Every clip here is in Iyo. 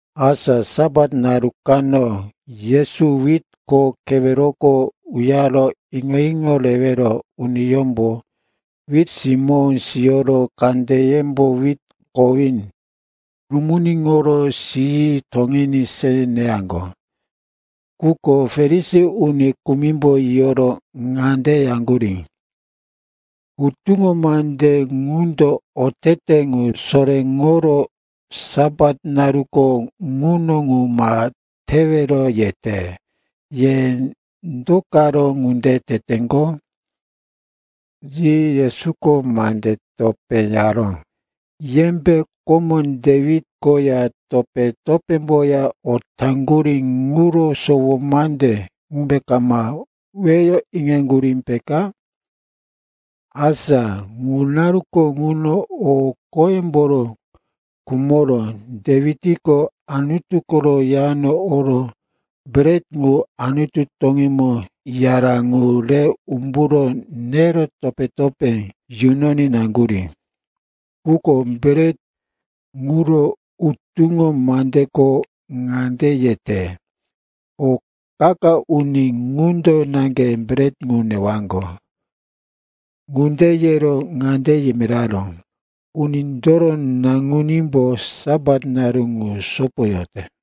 Asa Sapat naru kano Yesu wit kho keweroko uyaro iŋo-iŋo rewero uniyómbo wit simó siyoro kandeyembo wit kowí rumuniŋoro siyi toŋiní se neyaŋgo. Quko Farisi uni kumimbo yiyoro ŋande yaŋgurí, “Hutuŋo mande ŋundo otete ŋu soréŋoro, Sapat naruko ŋuno ŋu ma tewero, yete. Ye do karo ŋunde teteŋgo?” Yi Yesuko mande topé yaró, “Yembe komo Dewit koya topé-topémboya o taŋgurí ŋuro sowo mande ŋumbe kama weyo iŋaŋgurí, peka? Asa ŋu naruko ŋuno o qoyemboro khumoro Dewitko Anutu koro yano oro bret ŋu Anutu toŋímo yara ŋu re umburo nero topé-topé yunoní naŋgurí. Quko bret ŋuro, hutuŋo mandeko ŋande yete, o qa-qa uni ŋundo naŋge bret ŋu newaŋgo.” Ŋunde yero ŋande yimiraró, “Unindoro Naŋunímbo Sapat naru ŋu sopoyote.”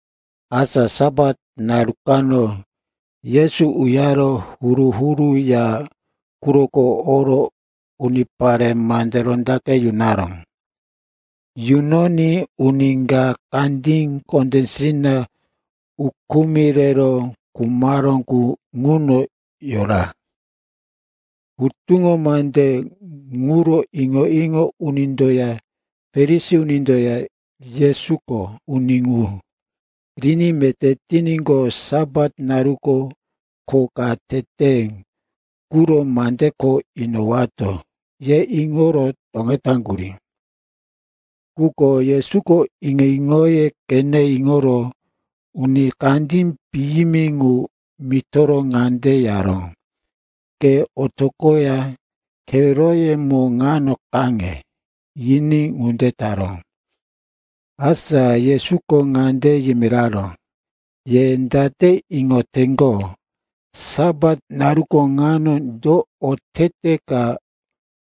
Asa Sapat naru kano Yesu uyaro huru-huru ya quroko oro unipare mande rondaqe yunaró. Yunoní uni ka kandí kondésina ukumi rero khumaró qu ŋuno yora. Hutuŋo mande ŋuro iŋo-iŋo unindoya Farisi unindoya, Yesuko uni ŋu riní meté tiníqo, Sapat naruko kho ka tete ŋuro mande kho inowato, yero iŋoro toŋetaŋgurí. Quko Yesuko iŋo-iŋoye qene iŋoro uni kandí piyimi ŋu mitoro ŋande yaró, “Ke otoqoya keweroyemo ŋano kaŋe,” yiní ŋunde taró. Asa Yesuko ŋande yimiraró, “Ye date iŋoteŋgo, Sapat naru ŋa do otete ka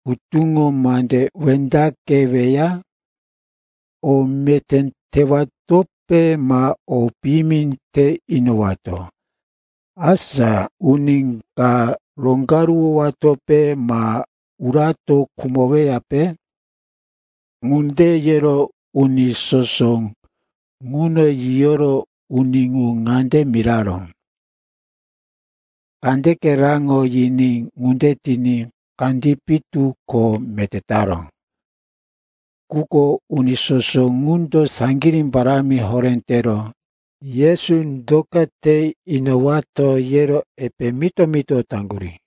hutuŋo mande wendaqeweya? O meté tewatope ma o piyimi te inowato, asa uni ka roŋgaruwowatope ma urato khumoweya?” Ŋunde yero uni soso ŋuno yiyoro uni ŋu ŋande miraró, “Kandeke raŋo,” yiní ŋunde tiní kandí pitu ko meté taró. Quko uni soso ŋundo saŋgirí parámi horé tero, Yesu do ka te inowato, yero epe mito-mito taŋgurí.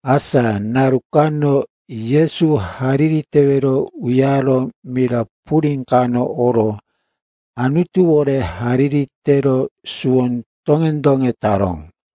Asa naru kano Yesu hariri tewero uyaro mira purí kano oro Anutuwore hariri tero suwo doŋe-doŋe taró.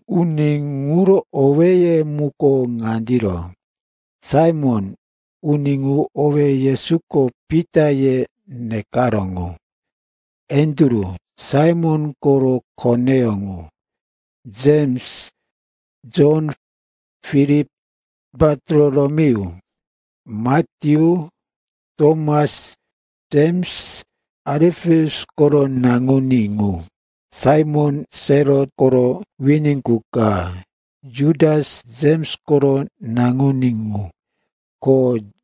Uni ŋuro owéye muko ŋandiro: Saimon, uni ŋu owé Yesuko, “Pita,” ye nekaró ŋu; Andru, Saimon koro koneyó ŋu; Jems; Jon; Filip; Bartolomeyu; Matyu; Tomas; Jems, Alipeus koro naŋuní ŋu; Saimon, Selot koro wini qu ka; Jutas, Jems koro naŋuní ŋu; ko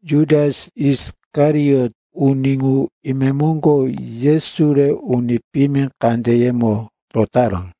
Jutas Isikariot, uni ŋu imemoŋgo Yesu re uni piyimi kandeyemo rotaró.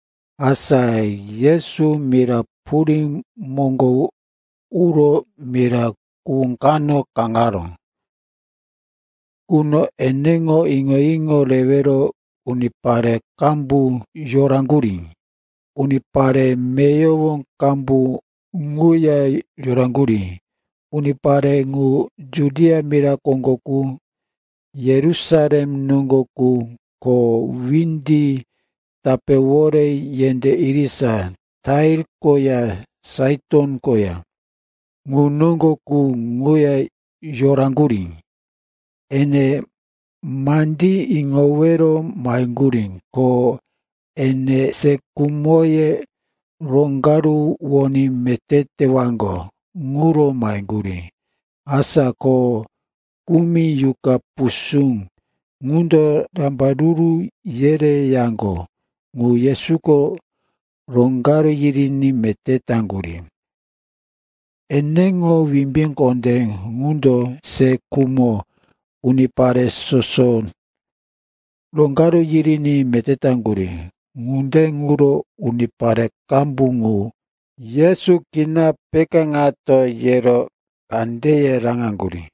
Asa Yesu mira purí moŋgo uro mira kuhú kano kaŋaró. Ŋuno eneŋo iŋo-iŋo rewero unipare qambu yoraŋgurí. Unipare meyowo qambu ŋuya yoraŋgurí. Unipare ŋu Judia mira koŋgo qu, Yerusalem noŋgo qu, ko windi tapéwore yendé irisa Tair koya Saiton koya ŋu noŋgo qu ŋuya yoraŋgurí. Ene mandí iŋowero maheŋgurí. Ko ene se khumoye roŋgaruwoní meté tewaŋgo ŋuro maheŋgurí. Asa ko kumi yuqa pusú qundo rambaruru yereyaŋgo ŋu Yesuko roŋgaru yiriní meté taŋgurí. Eneŋo wimbí kondé ŋundo se khumo unipare soso roŋgaru yiriní meté taŋgurí. Ŋunde ŋuro unipare qambu ŋu, Yesu kina pekáŋato, yero kandeye raŋaŋgurí.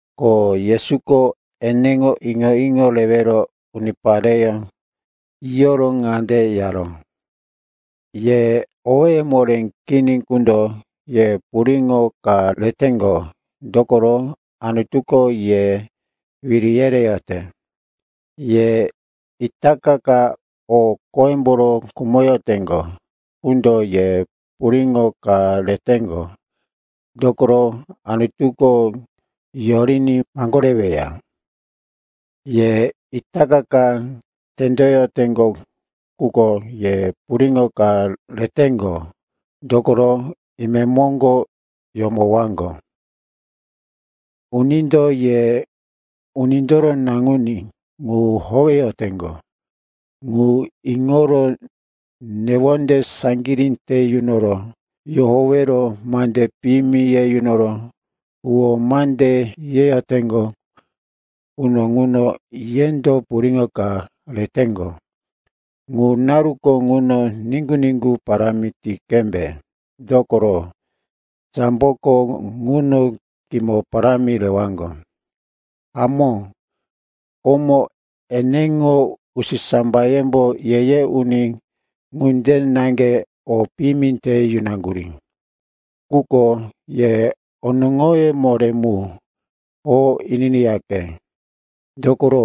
Ko Yesuko eneŋo iŋo-iŋo rewero unipareyó yiyoro ŋande yaró, “Ye owéye moré kini qundo, ye puriŋo ka reteŋgo, dokoro Anutuko ye wiri yereyote. Ye itaka ka o qoyemboro khumoyoteŋgo qundo, ye puriŋo ka reteŋgo, dokoro Anutuko yoriní maŋgoreweya. Ye itaka ka tendoyoteŋgo qundo, ye puriŋo ka reteŋgo, dokoro imemoŋgo yomowaŋgo. “Unindo ye Unindoro Naŋuní ŋu howeyoteŋgo ŋu iŋoro newonde saŋgirí te yunoro yohowero mande piyimi ye yunoro huwó mande yeyoteŋgo quno ŋuno yendo puriŋo ka reteŋgo. Ŋu naruko ŋuno niŋgu-niŋgu parámi ti qembe, dokoro samboko ŋuno kimo parámi rewaŋgo. Hamó, komo eneŋo usisambayembo ye-ye uni ŋunde naŋge o piyimi te yunaŋgurí. “Quko ye onoŋoye moré mu, o ininiyaqe, dokoro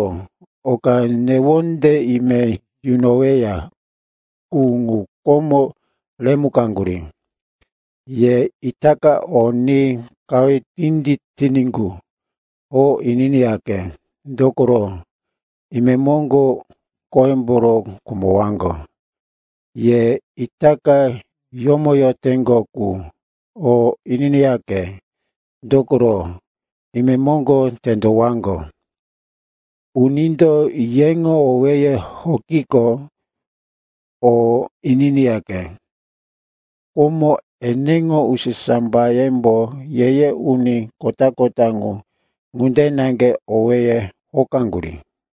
oka newonde ime yunoweya qu ŋu komo remukaŋgurí. Ye itaka o ni qahuye tinditiní qu, o ininiyaqe, dokoro imemoŋgo o qoyemboro khumowaŋgo. Ye itaka yomoyoteŋgo qu, o ininiyaqe, dokoro imemoŋgo tendowaŋgo. “Unindo yeŋo owéye hokiqo, o ininiyaqe. Komo, eneŋo usisambayembo ye-ye uni kota-kota ŋu ŋunde naŋge owéye hokaŋgurí.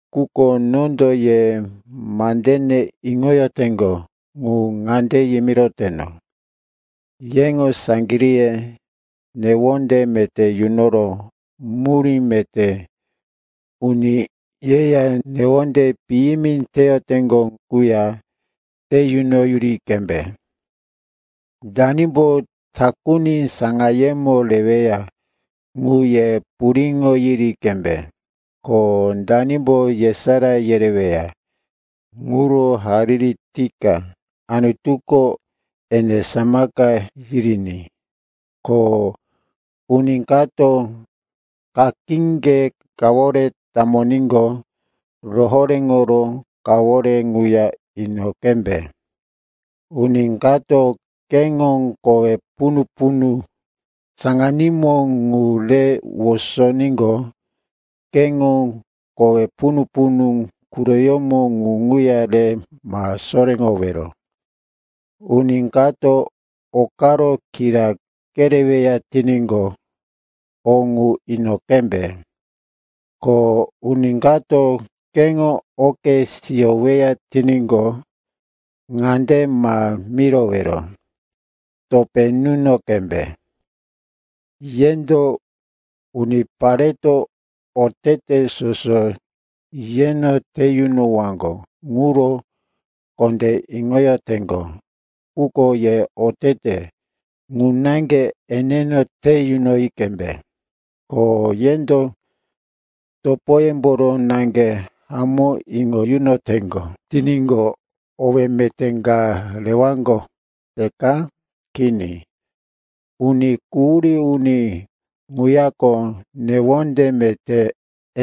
“Quko nondo ye mandene iŋoyoteŋgo ŋu ŋande yimiroteno, yeŋo saŋgiríye newonde meté yunoro murí meté uni yeya newonde piyimi teyoteŋgo quya te yunoyuri qembe. Danimbo takuni saŋayemo reweya, ŋu ye puriŋo yiri qembe. Ko danimbo yesará yereweya ŋuro hariri tika Anutuko ene samaka yiriní. Ko uni kato kakíŋge kawore tamoníqo, rohoréŋoro kawore ŋuya ino qembe. Uni kato keŋo kowe punu-punu saŋanímo qu re wosoníqo, keŋo kowe punu-punu quroyómo qu ŋuya re ma soréŋowero. Uni kato o karo kira kereweya tiníqo, o ŋu ino qembe. Ko uni kato keŋo oke siyoweya tiníqo, ŋande ma mirowero, topé nuno qembe. Yendo unipareto otete soso yeno te yunowaŋgo ŋuro kondé iŋoyoteŋgo ŋuko, ye otete ŋu naŋge eneno te yunoyi qembe. “Ko yendo topoyemboro naŋge hamó iŋo yunoteŋgo tiníqo, owé meté ka rewaŋgo, peka? Kini, uni quhurí uni ŋuyako newonde meté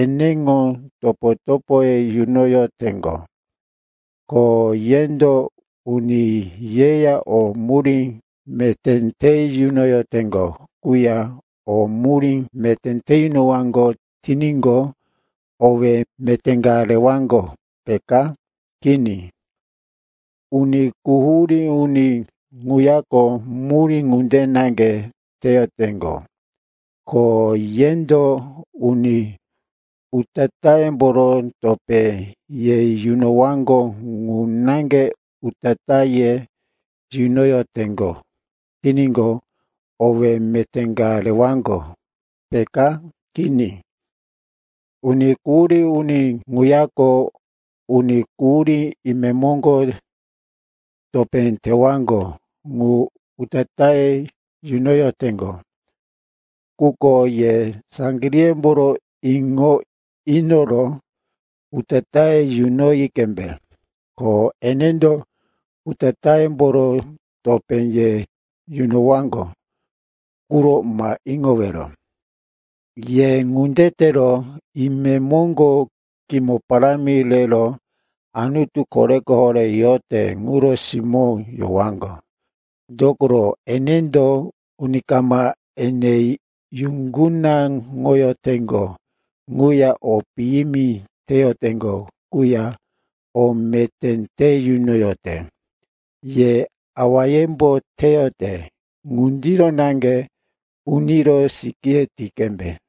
eneŋo topo-topoye yunoyoteŋgo. Ko yendo uni yeya o murí meté te yunoyoteŋgo quya o murí meté te yunowaŋgo tiníqo, owé meté ka rewaŋgo, peka? Kini, uni quhurí uni ŋuyako murí ŋunde naŋge teyoteŋgo. Ko yendo uni utatáyemboro topé ye yunowaŋgo ŋu naŋge utatáye yunoyoteŋgo tiníqo, owé meté ka rewaŋgo, peka? Kini, uni quhurí uni ŋuyako uni quhurí imemoŋgo topé tewaŋgo ŋu utatáye yunoyoteŋgo. Quko ye saŋgiríyemboro iŋo inoro utatáye yunoyi qembe. Ko enendo utatáyemboro topé ye yunowaŋgo ŋuro ma iŋowero. Ye ŋunde tero imemoŋgo kimo parámi rero Anutu Koreko Horé yote ŋuro simó yowaŋgo. Dokoro enendo uni kama ene yuŋgunaŋoyoteŋgo quya o piyimi teyoteŋgo quya o meté te yunoyote. Ye awayembo teyote ŋundiro naŋge uniro sikíye ti qembe.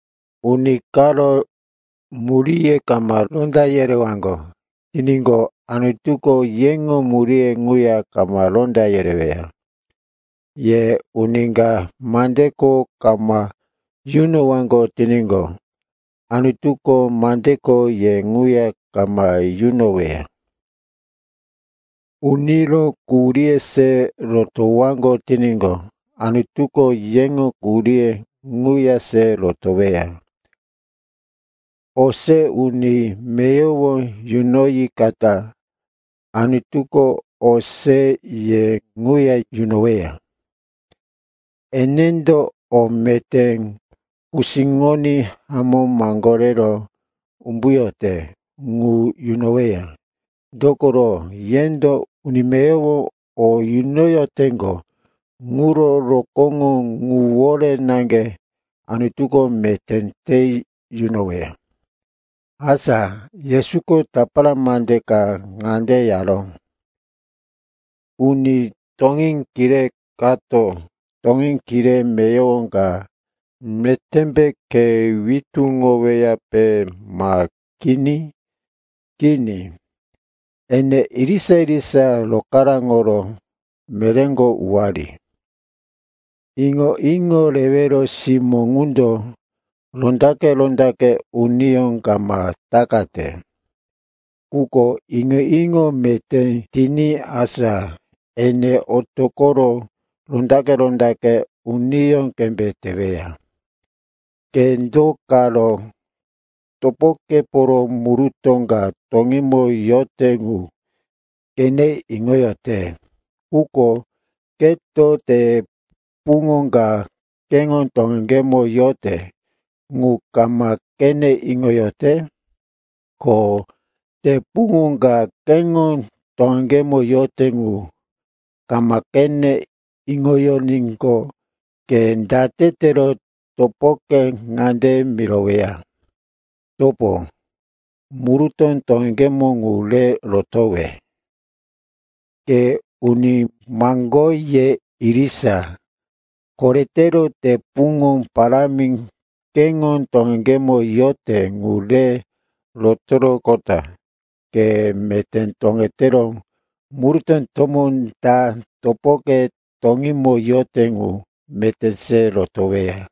“Uni karo muríye kama ronda yerewaŋgo tiníqo, Anutuko yeŋo muríye ŋuya kama ronda yereweya. Ye uni ka mande kho kama yunowaŋgo tiníqo, Anutuko mande kho ye ŋuya kama yunoweya. Uniro quhuríye se rotowaŋgo tiníqo, Anutuko yeŋo quhuríye ŋuya se rotoweya. O se uni meyowo yunoyikata Anutuko o se ye ŋuya yunoweya. Enendo o meté kusíŋoní hamó maŋgorero umbuyote ŋu yunoweya. Dokoro yendo uni meyowo o yunoyoteŋgo ŋuro rokóŋo ŋuwore naŋge Anutuko meté te yunoweya.” Asa Yesuko tapara mande ka ŋande yaró, “Uni toŋí kiré kato toŋí kiré meyowo ka metémbe khe witúŋoweyape, ma kini? Kini, ene irisa-irisa rokaráŋoro meréko uwari. Iŋo-iŋo rewero simó ŋundo rondaqe-rondaqe uniyó kama takate. Quko iŋo-iŋo meté tiní asa ene otoqoro rondaqe-rondaqe uniyó qembe teweya. “Ke do karo topokeporo murutó ka toŋímo yote ŋu qene iŋoyote, quko ke te puŋo ka keŋo toŋeŋgemo yote ŋu kama qene iŋoyote? Ko te puŋo ka keŋo toŋeŋgemo yote ŋu kama qene iŋoyoníqo, ke date tero topoke ŋande miroweya, ‘Topo, murutó toŋeŋgemo ŋu re rotowe?’ Ke uni maŋgoye irisa, koretero te puŋo parámi keŋo toŋeŋgemo yote ŋu re rotoroqota ke meté toŋetero murutó tomó ta topoke toŋímo yote ŋu meté se rotoweya.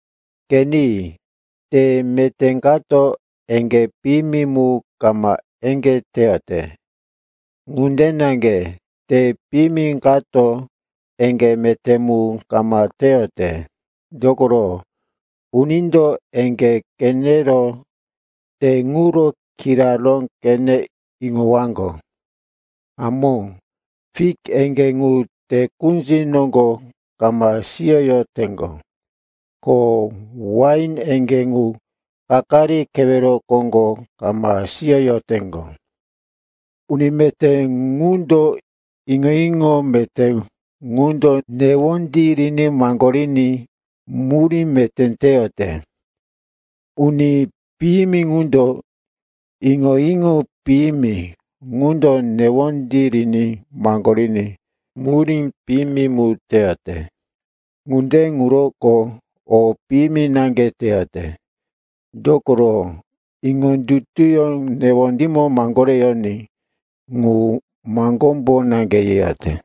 “Qeni, te meté kato eŋgé piyimi mu kama eŋgé teyote. Ŋunde naŋge te piyimi kato eŋgé meté mu kama teyote. Dokoro, unindo eŋgé qenero te ŋuro kiraró qene iŋowaŋgo. Hamó, fik eŋgé ŋu te kunzi noŋgo kama siyoyoteŋgo, ko wain eŋgé ŋu kakari kewero koŋgo kama siyoyoteŋgo. Uni meté ŋundo iŋo-iŋo meté qundo newondí riní maŋgoriní murí meté teyote. Uni piyimi ŋundo iŋo-iŋo piyimi qundo newondí riní maŋgoriní murí piyimi mu teyote. Ŋunde ŋuroko o piyimi naŋge teyote. Dokoro iŋondutu newondímo maŋgoreyoní ŋu maŋgómbo naŋge yeyote.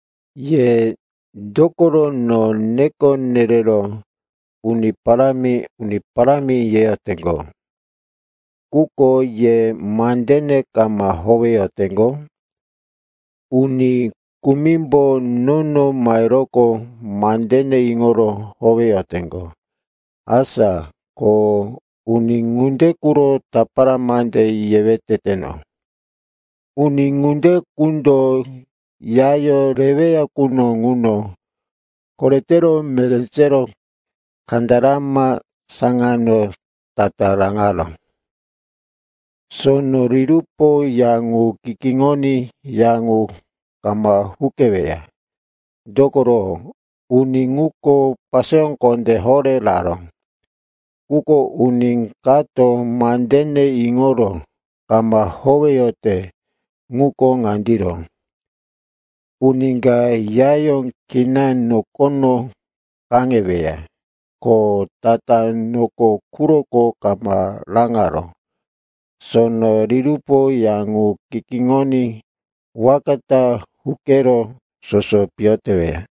“Ye dokoro no neko nerero, ‘Uni Parámi, Uni Parámi,’ yeteŋgo, quko ye mandene kama howeyoteŋgo? Uni kumimbo nono maheroqo mandene iŋoro howeyoteŋgo. Asa ko uni ŋunde quro tapara mande yewe teteno. Uni ŋunde qundo yayó reweya quno ŋuno koretero meré sero kandarama saŋano tatá raŋaró. Sono rirupo ya ŋu kikiŋoní ya ŋu kama huqeweya. Dokoro uni ŋuko paseyó kondé horé raró. Quko uni kato mandene iŋoro kama howeyote ŋuko ŋandiro, uni ka yayó kina nokono kaŋeweya, ko tatá noko quroko kama raŋaró. Sono rirupo ya ŋu kikiŋoní waka ta huqero soso piyo teweya.